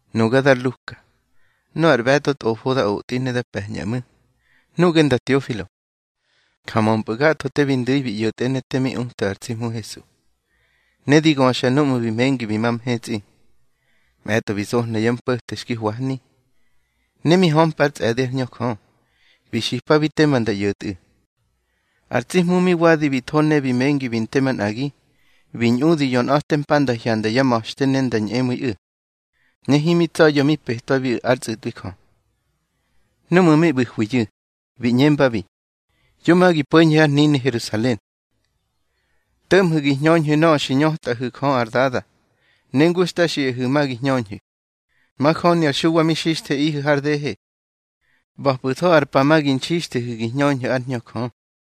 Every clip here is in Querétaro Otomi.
Nuga dar Luka, nöꞌö ar ꞌbe̱tꞌo tꞌofo da otꞌi ne da pe̱ñꞌa ꞌmu̱, nuꞌge nda Teofilo, ja mömpꞌu̱ gatho te bi ndu̱i bi ꞌyo̱tꞌe ne te mi uta ar tsi Hmu Hesu, ne di göxa núꞌmu̱ bi mengi bi ma mhetsꞌi. Mꞌe̱tꞌo bi zohna yá mpo̱te xki hwahni, ne mi hömpa ár tsꞌe̱di ár Hñö Jö, bi xipabi tema nda ꞌyo̱tꞌu̱. Ar tsi Hmu mi wadi bi tho ne bi mengi bi nte manꞌagi, bi ñꞌudi yonꞌa̱te mpa nda hyanda yá ma̱xte ne nda ñꞌemu̱iꞌu̱, ne himi tsa̱ya̱ mi petwabiꞌu̱ ár tsꞌu̱tꞌwi Jö. Núꞌmu̱ mi ꞌbu̱hwiyu̱, bi ꞌñembabi: —Yo ma gi po̱ñhu̱ har hnini Herusalen. To̱ꞌmhu̱ gi hñöñhu̱ nöꞌö xi ñötꞌahu̱ Jö ar Dada, ne ngu xta xiꞌahu̱ ma gi hñöñhu̱. Majöni ar Xuwa mi xixtheꞌihu̱ har dehe. ꞌBa̱pꞌu̱tho ar pa ma gi nxixthehu̱ gi hñöñhu̱ ár Hñö Jö.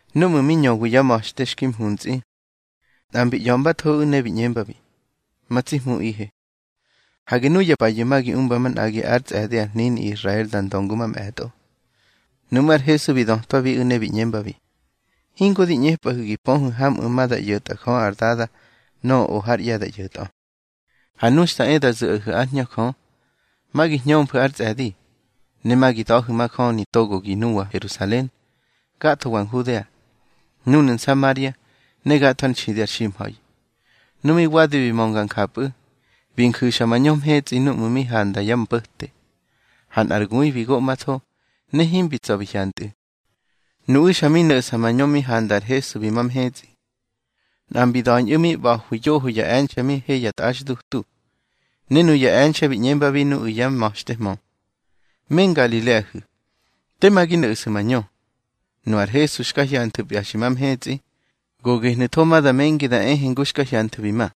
Núꞌmu̱ mi ñöwi yá ma̱xte xki mhuntsꞌi, nꞌa mbi ꞌya̱mbathoꞌu̱ ne bi ꞌñembabi: —Ma tsi Hmuꞌihe, hage nuya payu̱ ma gi umba manꞌagi ár tsꞌe̱di ar hnini Israel da ndö ngu mamꞌe̱tꞌo. Nuꞌmú̱ ar Hesu bi dötwabiꞌu̱ ne bi ꞌñembabi: —Hingo di ꞌñepꞌahu̱ gi pöhu̱ hamꞌu̱ ma da ꞌyo̱tꞌa Jö ar Dada nöꞌö o hár ꞌye̱ da ꞌyo̱tꞌö. Ha nu xta e da zu̱ꞌahu̱ ár Hñö Jö, ma gi hñömfu̱ ár tsꞌe̱di, ne ma gi da̱hu̱ majöni togogi nuwa Herusalen, gathowa Nhudea, núnu̱ Nsamaria, ne gatho ár nxidi ar ximha̱i. Nu mi wadi bi mönga njapꞌu̱, bi nju̱xa mañö mhetsꞌi núꞌmu̱ mi handa yá mpo̱te, ha nꞌar gui bi goꞌmatho, ne himbi tsa̱ bi hyantꞌu̱. Nuꞌu̱ xa mi no̱ꞌsa mañö mi handa ar Hesu bi ma mhetsꞌi, nꞌa mbi da̱ñꞌu̱ mi ꞌba̱hwi yoho ya e̱nxe̱ mi he ya tꞌaxdutu. Ne nuya e̱nxe̱ bi ꞌñembabi nuꞌu̱ yá ma̱xtehmö: —Me Ngalileahu̱, tema gi no̱ꞌsu̱ mañö. Nu ar Hesu xka hyanthu̱pya xi ma mhetsꞌi, go gehnu̱tho ma da mengi da ehe ngu xka hyanthu̱ bi ma.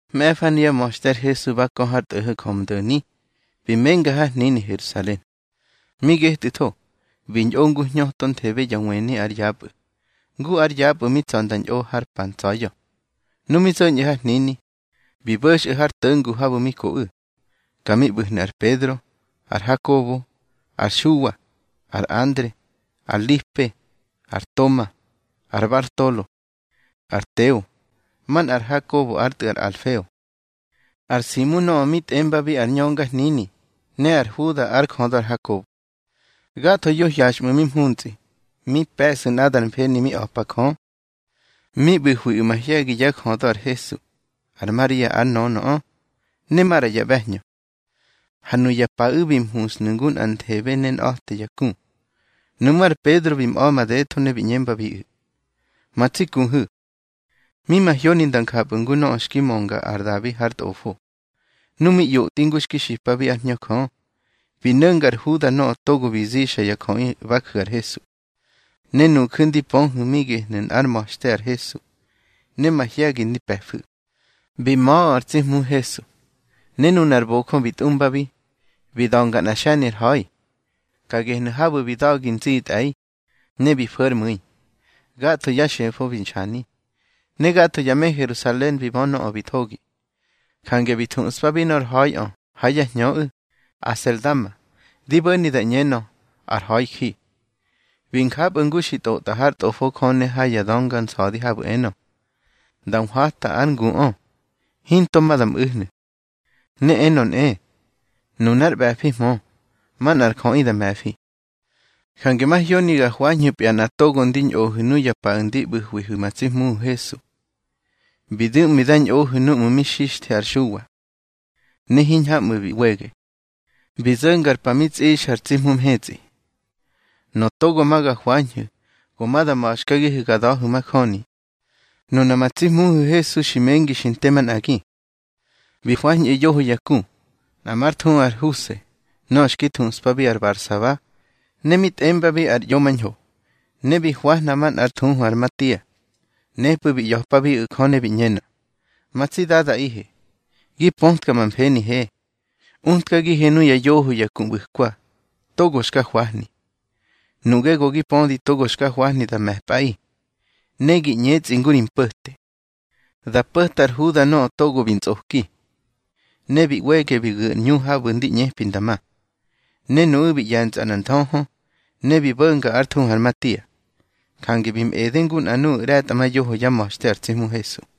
Mꞌe̱fa nuyá ma̱xte ar Hesu, ba kö har tꞌo̱ho̱ Njömdo̱ni, bi menga har hnini Herusalen. Mi getꞌu̱tho, bi ñꞌo ngu hñötonthebe ya wëni ár yapꞌu̱, ngu ár yapꞌu̱ mi tsa̱ nda ñꞌo har pa ntsa̱ya̱. Nu mi zo̱ñꞌu̱ har hnini, bi bo̱xꞌu̱ har to̱ngu habu̱ mi koꞌu̱. Ka mi ꞌbu̱hnu̱ ar Pedro, ar Hakobo, ar Xuwa, ar Andre, ar Lipe, ar Toma, ar Bartolo, ar Teo, manꞌa ar Hakobo ár tꞌu̱ ar Alfeo, ar Simu nöꞌö mi tꞌembabi ar ñöngahnini, ne ar Huda ár jödö ar Hakobo. Gathoyu̱ hyaxꞌmu̱ mi mhuntsꞌi, mi pe̱sꞌu̱ nꞌadar mfeni mi a̱pa Jö. Mi ꞌbu̱hwiꞌu̱ mahye̱gi yá jödö ar Hesu, ar Maria ár nönöꞌö, ne maꞌra ya ꞌbe̱hñö. Ha nuya paꞌu̱ bi mhushnu̱ ngu nꞌanthebe ne nꞌa̱te ya ku. Nuꞌmú̱ ar Pedro bi mꞌa̱ madetho ne bi ꞌñembabiꞌu̱: —Ma tsi kuhu̱, mi mahyoni nda njapꞌu̱ ngu nöꞌö xki mönga ar Dabi har Tꞌofo, nu mi ꞌyotꞌi ngu xki xipabi ár Hñö Jö. Bi no̱nga ar Huda nöꞌö togo bi zixa ya jöꞌi ba ju̱ ar Hesu. Ne nuju̱ ndi pöhu̱ mi gehnu̱ nꞌár ma̱xte ar Hesu, ne mahye̱gi ndi pe̱fu̱. Bi ma̱ꞌö ar tsi Hmu Hesu, ne nunar bojö bi tꞌumbabi, bi da̱nga nꞌa xe̱ni ar ha̱i. Ka gehnu̱ habu̱ bi da̱gi nzitꞌe̱i, ne bi fo̱ ár mu̱i, gatho yá xefo bi nxani. Ne gatho ya me Herusalen bi bö nöꞌö bi thogi, jange bi thuꞌspabi nor ha̱iꞌö ha yá hñöꞌu̱: Aseldama, di bo̱ni da ꞌñenö, ar Ha̱iji. Bi njapꞌu̱ ngu xi tꞌotꞌa hár Tꞌofo Jö ne ha ya Dönga Nsa̱di habu̱ enö: Nda nhwata ár nguꞌö, hinto ma da mꞌu̱hnu̱. Ne enö nꞌe: Nunár ꞌbe̱fihmö, manꞌar jöꞌi da me̱fi. Jange mahyoni ga hwañhu̱pya nꞌa togo ndi ñꞌohu̱ nuya paꞌu̱ ndi ꞌbu̱hwihu̱ ma tsi Hmuhu̱ Hesu. Bi du̱ꞌmi da ñꞌohu̱ núꞌmu̱ mi xixthe ar Xuwa ne hiñhamꞌu̱ bi ꞌwege, bi zo̱nga ar pa mi tsꞌixa ar tsi Hmu mhetsꞌi. Nöꞌö togo ma ga hwañhu̱ go ma da ma̱xkagihu̱ ga da̱hu̱ majöni, nuna ma tsi Hmuhu̱ Hesu xi mengi xi nte manꞌagi. Bi hwañꞌu̱ yoho ya ku, nꞌa már thuhu ar Huse nöꞌö xki thuꞌspabi ar Barsaba, ne mi tꞌembabi ar ꞌYomañho, ne bi nhwahna manꞌa ár thuhu ar Matia. Nepꞌu̱ bi ꞌya̱pabiꞌu̱ Jö ne bi ꞌñenö: —Ma tsi Dadaꞌihe, gi pötka ma mfenihe, utkagihe nuya yoho ya ku ꞌbu̱kwa, togo xka hwahni. Nuꞌge go gi pödi togo xka hwahni da me̱pꞌaꞌi. Ne gi ꞌñetsꞌi ngu ri mpo̱te, da po̱ta ar Huda nöꞌö togo bi ntsꞌoki, ne bi ꞌwege bi gu̱ ar ꞌñu habu̱ ndi ꞌñepi nda ma. Ne nuꞌu̱ bi ꞌye̱ntsꞌa nꞌar nthöhö, ne bi bo̱nga ár thuhu ar Matia. Jange bi mꞌede ngu nꞌa nuꞌu̱ ꞌre̱tꞌamayoho yá ma̱xte ar tsi Hmu Hesu.